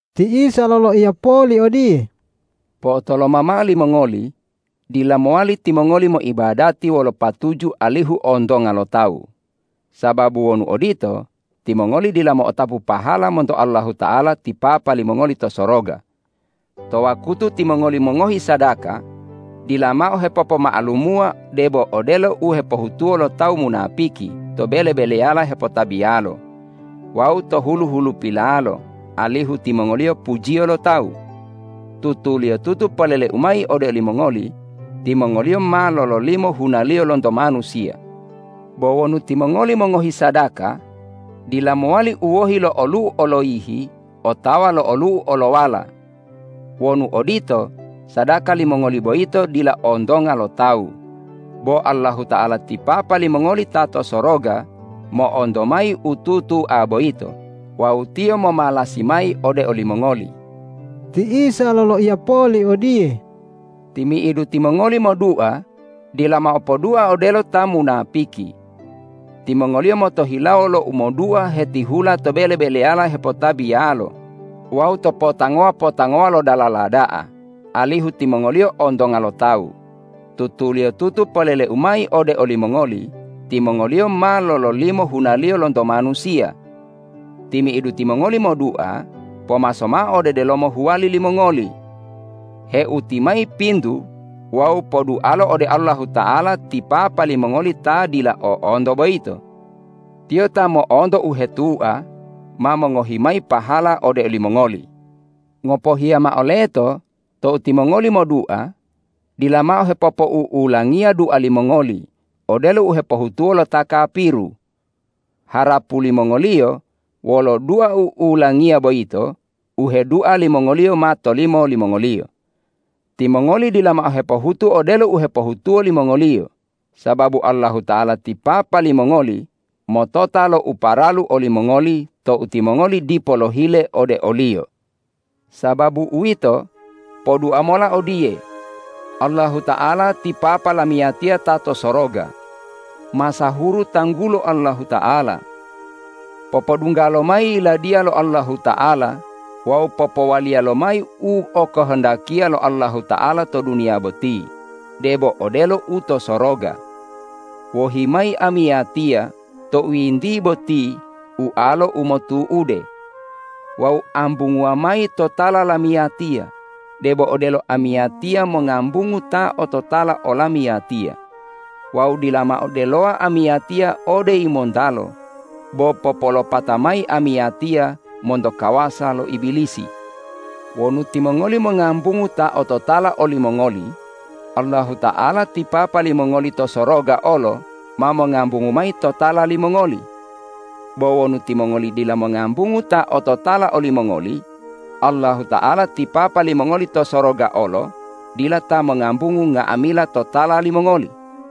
Ti Isa loloiya poli odiye,”Po'otoloma mao limongoli, dila mowali timongoli moibadati wolo patuju alihu ontonga lo tawu. Sababu wonu odito, timongoli dila mo'otapu pahala monto Allahuta'ala ti Papa limongoli to soroga. To wakutu timongoli mongohi sadaka dila mao hepopoma'alumuwa debo odelo u hepohutuwo lo ta munapiki to bele-beleyala hepotabiyalo wawu to hulu-hulupilalo, alihu timongoliyo pujiyo lo tawu. Tutuliyotutu polele-U mayi ode olimongoli: Timongoliyo ma lololimo hunaliyo lonto manusiya. Bo wonu timongoli mongohi sadaka, dila mowali u wohi lo olu'u oloyihi otawa lo olu'u olowala. Wonu odito, sadaka limongoli boyito dila ontonga lo tawu, bo Allahuta'ala ti Papa limongoli ta to soroga mo'onto mayi u tutua boyito wawu Tiyo momalasi mayi ode olimongoli.” Ti Isa loloiya poli odiye,”Timi'idu timongoli modua dila mao podua odelo ta munapiki. Timongoliyo motohilawo lo umodua hetihula to bele-beleyala hepotabiyalo wawu to potangowa-potangowa lo dalala da'a, alihu timongoliyo ontonga lo tawu. Tutuliyotutu polele-U mayi ode olimongoli: Timongoliyo ma lololimo hunaliyo lonto manusiya. Timi'idu timongoli modua, pomaso mao ode delomo huwali limongoli, heuti mayi pintu wawu podualo ode Allahuta'ala ti Papa limongoli ta dila o'onto boyito. Tiyo ta mo'onto u hetua ma mongohi mayi pahala ode olimongoli. Ngopohiya mao leto tou timongoli modua, dila mao hepopou'ulangiya dua limongoli odelo u hepohutuwo lo ta kapiru. Harapu limongoliyo wolo dua u'ulangiya boyito u hedua limongoliyo ma tolimo limongoliyo. Timongoli dila mao hepohutu odelo u hepohutuwo limongoliyo, sababu Allahuta'ala ti Papa limongoli motota lo uparalu olimongoli tou timongoli dipo lohile ode o-Liyo. Sababu uwito, podua mola odiye, ’Allahuta'ala ti Papa lamiyatiya ta to soroga, masahuru tanggulo Allahuta'ala. Popodungga lomayi Yiladiya lo Allahuta'ala wawu popowaliya lomayi u okohondakiya lo Allahuta'ala to duniya boti debo odelo u to soroga. Wohi mayi amiyatiya tou yintiye boti ualo u motu'ude. Wawu ambunguwa mayi totala lamiyatiya debo odelo amiyatiya mongambungu ta ototala olamiyatiya. Wawu dila mao delowa amiyatiya ode yimontalo, bo popolopata mayi amiyatiya monto kawasa lo Ibilisi.’ Wonu timongoli mongambungu ta ototala olimongoli, Allahuta'ala ti Papa limongoli to soroga olo ma mongambungu mayi totala limongoli. Bo wonu timongoli dila mongambungu ta ototala olimongoli, Allahuta'ala ti Papa limongoli to soroga olo dila ta mongambungu nga'amila totala limongoli.”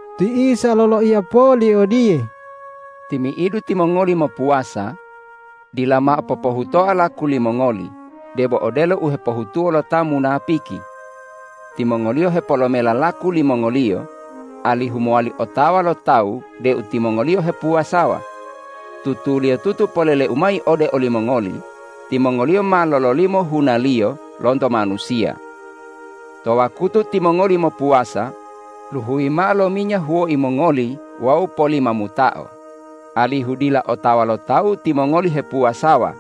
Ti Isa loloiya poli odiye,”Timi'idu timongoli mopuwasa dila mao popohutoa laku limongoli debo odelo u hepohutuwo lo ta munapiki. Timongoliyo hepolomela laku limongoliyo, alihu mowali otawa lo tawu deu timongoliyo hepuwasawa. Tutuliyotutu polele-U mayi ode olimongoli: Timongoliyo ma lololimo hunaliyo lonto manusiya. To wakutu timongoli mopuwasa, luhuyi mao lo minya huwoi mongoli wawu polimamutao, alihu dila otawa lo tawu timongoli hepuwasawa.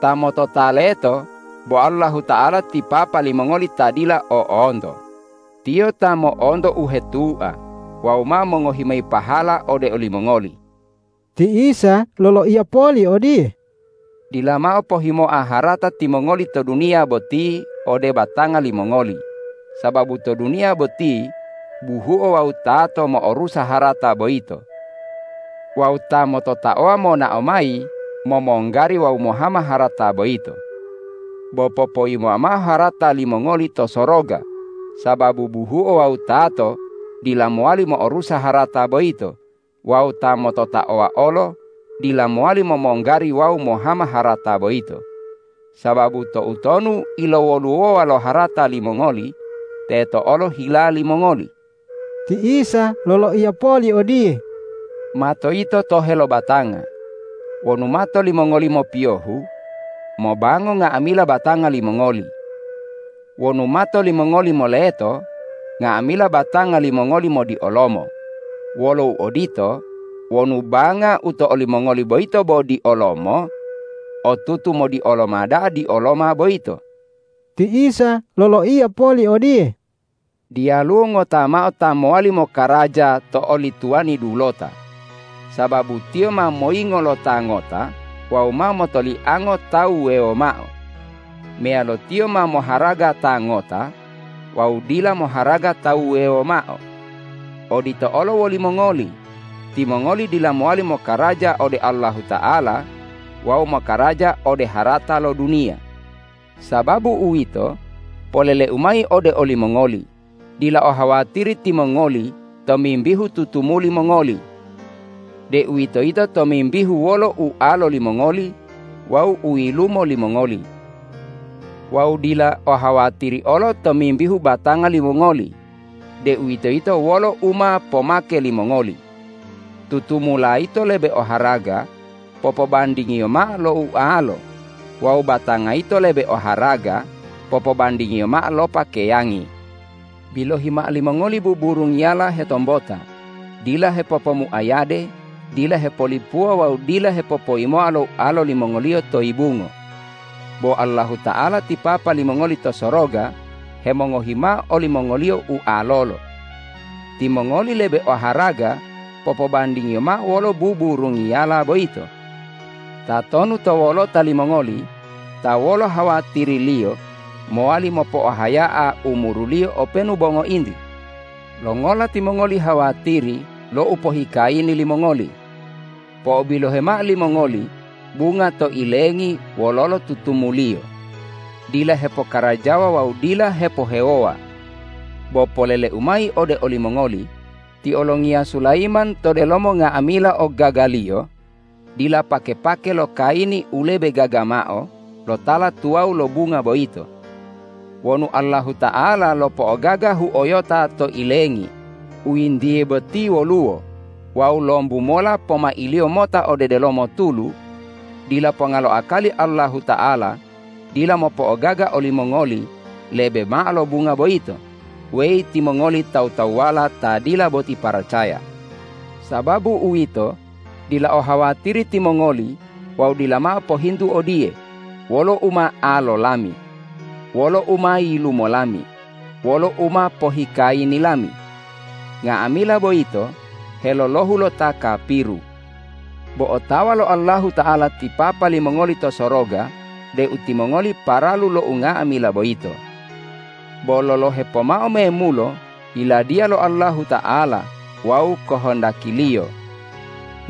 Ta motota leto bo Allahuta'ala ti Papa limongoli ta dila o'onto. Tiyo ta mo'onto u hetua wawu ma mongohi mayi pahala ode olimongoli.” Ti Isa loloiya poli odiye,”Dila mao pohimoa harata timongoli to duniya boti ode batanga limongoli, sababu to duniya boti buhuo wawu tato mo'orusa harata boyito. Wawu ta mototaowa monao mayi momonggari wawu mohama harata boyito. Bo popoyimoa mao harata limongoli to soroga, sababu buhuo wawu tato dila mowali mo'orusa harata boyito wawu ta mototaowa olo dila mowali momonggari wawu mohama harata boyito. Sababu toutonu ilowoluwowa lo harata limongoli teto olo hila limongoli!” Ti Isa loloiya poli odiye,”Mato yito tohe lo batanga. Wonu mato limongoli mopiyohu, mobango nga'amila batanga limongoli. Wonu mato limongoli moleto, nga'amila batanga limongoli modiolomo. Wolo uodito, wonu banga u to olimongoli boyito bo diolomo, otutu modioloma da'a dioloma boyito.” Ti Isa loloiya poli odiye,”Diyaluwo ngota mao ta mowali mokaraja to oli tuwani dulota, sababu tiyo ma moyingo lo ta ngota wawu ma motoliango ta wuwewo mao. Meyalo tiyo ma moharaga ta ngota wawu dila moharaga ta wuwewo mao. Odito olo wolimongoli, timongoli dila mowali mokaraja ode Allahuta'ala wawu mokaraja ode harata lo duniya. Sababu uwito, polele-U mayi ode olimongoli: Dila ohawatiri timongoli tomimbihu tutumuli mongoli, deuwitoyito tomimbihu wolo ualo limongoli wawu u yilumo limongoli. Wawu dila ohawatiri olo tomimbihu batanga limongoli, deuwitoyito wolo u ma pomake limongoli. Tutumula yito lebe oharaga popobandingiyo mao lo ualo wawu batanga yito lebe oharaga popobandingiyo mao lo pakeyangi. Bilohi mao limongoli buburungiyala hetombota, dila hepopomuayade, dila hepolipuwa wawu dila hepopoyimoa lo ualo limongoliyo to yibungo, bo Allahuta'ala ti Papa limongoli to soroga hemongohi mao olimongoliyo ualolo. Timongoli lebe oharaga popobandingiyo mao wolo buburungiyala boyito. Tatonu to wolota limongoli ta wolo hawatiriliyo mowali mopo'ohaya'a umuruliyo openu bo ngointi? Longola timongoli hawatiri lo upohikayini limongoli? Po'obilohe mao limongoli bunga to ilengi wololo tutumuliyo. Dila hepokarajawa wawu dila hepohewowa. Bo polele-U mayi ode olimongoli: Ti olongiya Sulayiman to delomo nga'amila ogagaliyo dila pake-pake lo kayini u lebe gaga mao lo tala tuwawu lo bunga boyito. Wonu Allahuta'ala lopo'ogaga huoyota to ilengi u yintiye boti woluwo wawu lombu mola pomailiyo mota ode delomo tulu, dila ponga lo akali Allahuta'ala dila mopo'ogaga olimongoli lebe mao lo bunga boyito, weyi timongoli tawu-tawuwala ta dila boti paracaya. Sababu uwito, dila ohawatiri timongoli wawu dila mao pohintu odiye, ’Wolo u ma alo lami? Wolo u ma yilumo lami? Wolo u ma pohikayini lami?’ Nga'amila boyito helolohu lo ta kapiru. Bo otawa lo Allahuta'ala ti Papa limongoli to soroga deu timongoli paralu lo unga'amila boyito. Bo lolohe pomao memulo Yiladiya lo Allahuta'ala wawu kohondaki-Liyo.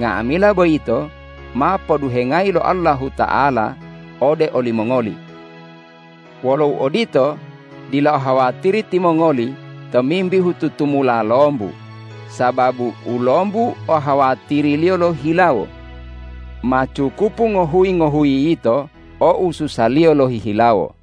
Nga'amila boyito ma poduhengayi lo Allahuta'ala ode olimongoli. Wolo uodito, dila ohawatiri timongoli tomimbihu tutumula lombu, sababu u lombu o hawatiriliyo lohihilawo. Ma cukupu ngohuyi-ngohuyi yito o ususaliyo lohihilawo.”